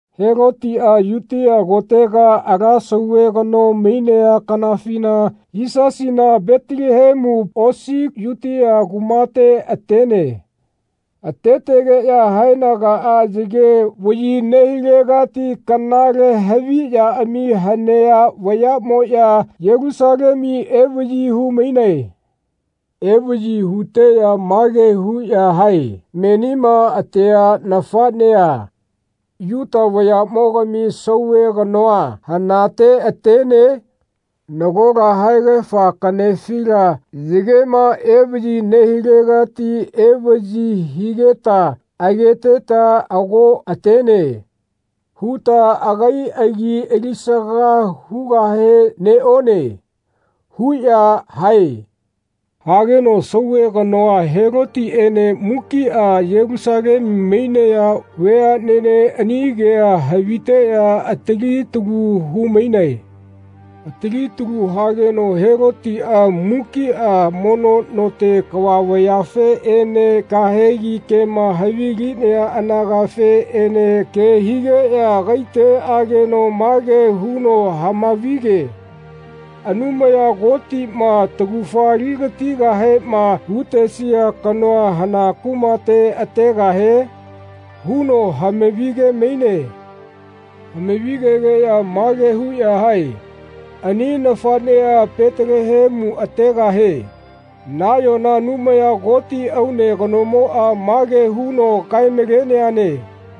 Helotiꞌa Yutia kotega ala sauve kano mainea kanafina Yisasina Petelehemu osi Yutia kumate atene. Atetegeꞌya haenagaꞌa yage vaꞌyi nehilegati kanale haviꞌyaꞌami hanea vayaꞌmoꞌya Yelusalemu evaꞌyi hu-mainae. Evaꞌyi huteꞌya mage huꞌya hae “Menima atea nafaꞌnea, Yuta vayaꞌmogami sauve kanoa, hanate atene? Nagola haegafa kaꞌnefila yagema evaꞌyi nehilegati evaꞌyi higeta ageteta ‘Ago atene.’ huta agai agi alisaga hugahe neꞌone.” huꞌya hae. Hageno sauve kanoa Helotiꞌene mukiꞌa Yelusalemu mainaya veaꞌnene ani kea haviteꞌya atali talu hu-mainae. Atali talu hageno Helotiꞌa mukiꞌa mono note kava vayafeꞌene kahegi kema havilinaya anagafeꞌene ke higeꞌya agaite ageno mage huno hama-vige “Anumaya Kotiꞌma taugafa ali-gatigahema hu-tesia kanoa hana kumate ategahie?” huno hama-vi-ge-maine. Hama-vi-gegeꞌya mage huꞌya hae “Ani nafaꞌnea Petelehemu ategahie. Nayona Anumaya Koti aune kanomoꞌa mage huno kae-maleneane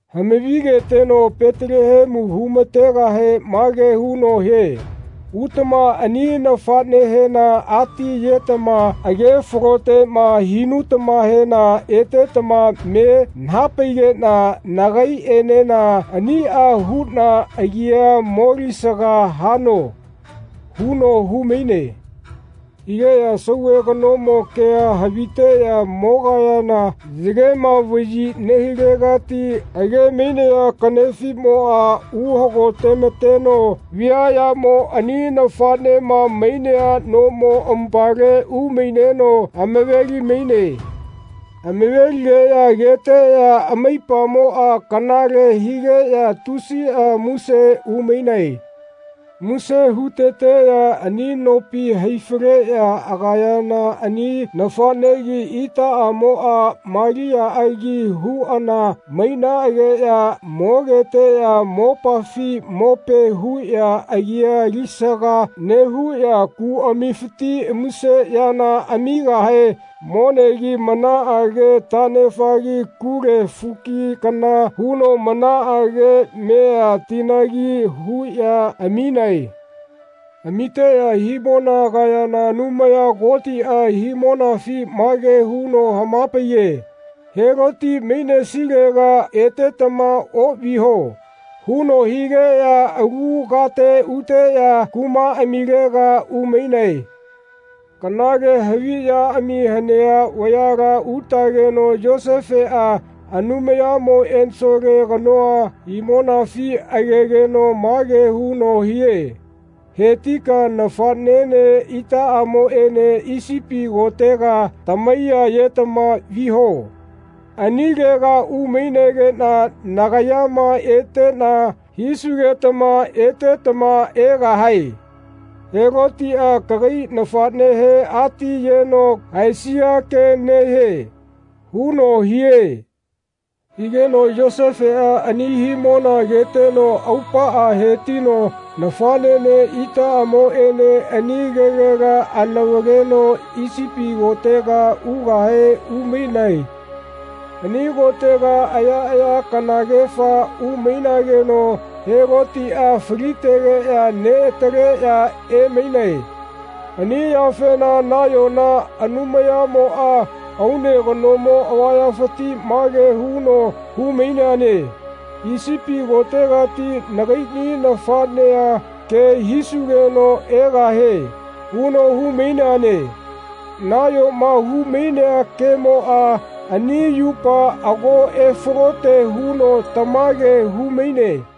Hama-vigeteno Petelehemu hu-ma-tegahe mage huno hie “Utama ani nafaꞌnehena ati-yetama age-faloteꞌma hinutamahena etetama me naha-paigeꞌna nagaiꞌenena aniꞌa huꞌna agia molisaga hano.” huno hu-maine. Higeꞌya sauve kanomo kea haviteꞌya mogayana yagema vaꞌyi nehilegati age-mainaya kaꞌnefimoꞌa uhagote-ma-teno viaꞌyamo ani nafaꞌnema mainea nomo amupale umaineno amave-li-maine. Amave-ligeꞌya ageteꞌya amaipamoꞌa kanale higeꞌya tusiꞌa muse hu-mainae. Muse hu-teteꞌya ani nopi hai-faleꞌya agayana ani nafaꞌnegi itaꞌamoꞌa Maliaꞌagi huꞌana mainaꞌageꞌya mogeteꞌya mopafi mope huꞌya agia alisaga nehuꞌya kuꞌamifiti muse yana amigahe monegi manaꞌage taꞌnefagi kule fuki kana huno manaꞌage mea tinagi huꞌya aminae. Amiteꞌya himona agayana Anumaya Kotiꞌa himonafi mage huno hama-paiye “Heloti mainesilega etetama oꞌviho” huno higeꞌya alu kate uteꞌya kumaꞌamilega umainae. Kanale haviꞌyaꞌami hanea vayala utageno Yosefeꞌa Anumayamo ensole kanoa himonafi agegeno mage huno hie “Hetika nafaꞌnene itaꞌamoꞌene Isipi kotega tamaiya-yetama viho. Anilega umainegeꞌna nagayama eteꞌna hisugetama etetama egahae. Helotiꞌa kagai nafaꞌnehe ati-yeno haesia ke nehie.” huno hie. Higeno Yosefeꞌa ani himona ageteno aupaꞌa hetino nafaꞌnene itaꞌamoꞌene ani kegela anavaleno Isipi kotega ugahe umainae. Ani kotega ayaꞌaya kanagefa umainageno Helotiꞌa falitegeꞌya neꞌataleꞌya emainae. Ani yafena nayona Anumayamoꞌa aune kanomo avayafiti mage huno hu-maineane “Isipi kotegati nagaiꞌni nafaꞌnea ke hisugeno egahie” huno hu-maineane. Nayoma hu-mainea kemoꞌa ani yupa ago efalote huno tamage hu-maine.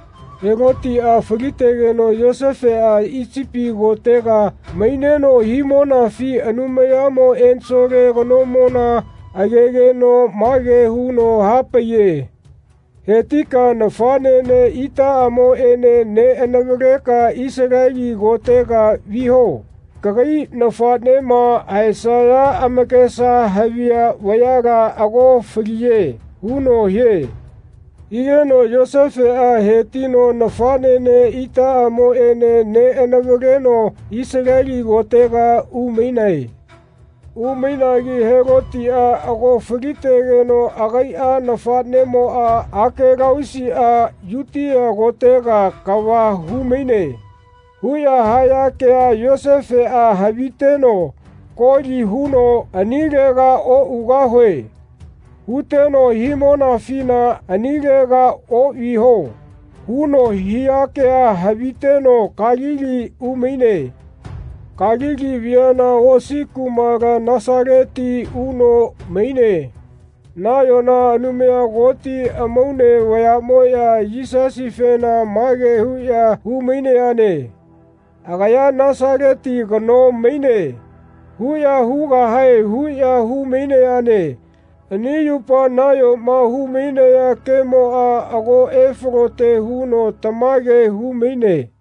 Helotiꞌa falitegeno Yosefeꞌa Isipi kotega maineno himonafi Anumayamo ensole kanomona agegeno mage huno hapaiye. “Hetika nafaꞌnene itaꞌamoꞌene neꞌanavaleka Isaleli kotega viho. Kagai nafaꞌnema haesaya amakesa haviya vayala ago faliye.” huno hie. Higeno Yosefeꞌa hetino nafaꞌnene itaꞌamoꞌene neꞌanavaleno Isaleli kotega umainae. Umainagi “Helotiꞌa ago falitegeno agaiꞌa nafaꞌnemoꞌa Akelausiꞌa Yutia kotega kava hu-maine.” huꞌya haya kea Yosefeꞌa haviteno koli huno “Anilega oꞌugahue.” huteno himonafina “Anilega oꞌviho.” huno hia kea haviteno Kalili umaine. Kalili viana osi kumala Nasaleti uno maine. Nayona Anumaya Koti amaune vayaꞌmoꞌya Yisasifena mage huꞌya hu-mainayane “Agaya Nasaleti kano maine.” huꞌya hugahae huꞌya hu-mainayane Ani yupa nayoma hu-mainaya kemoꞌa ago efalote huno tamage hu-maine.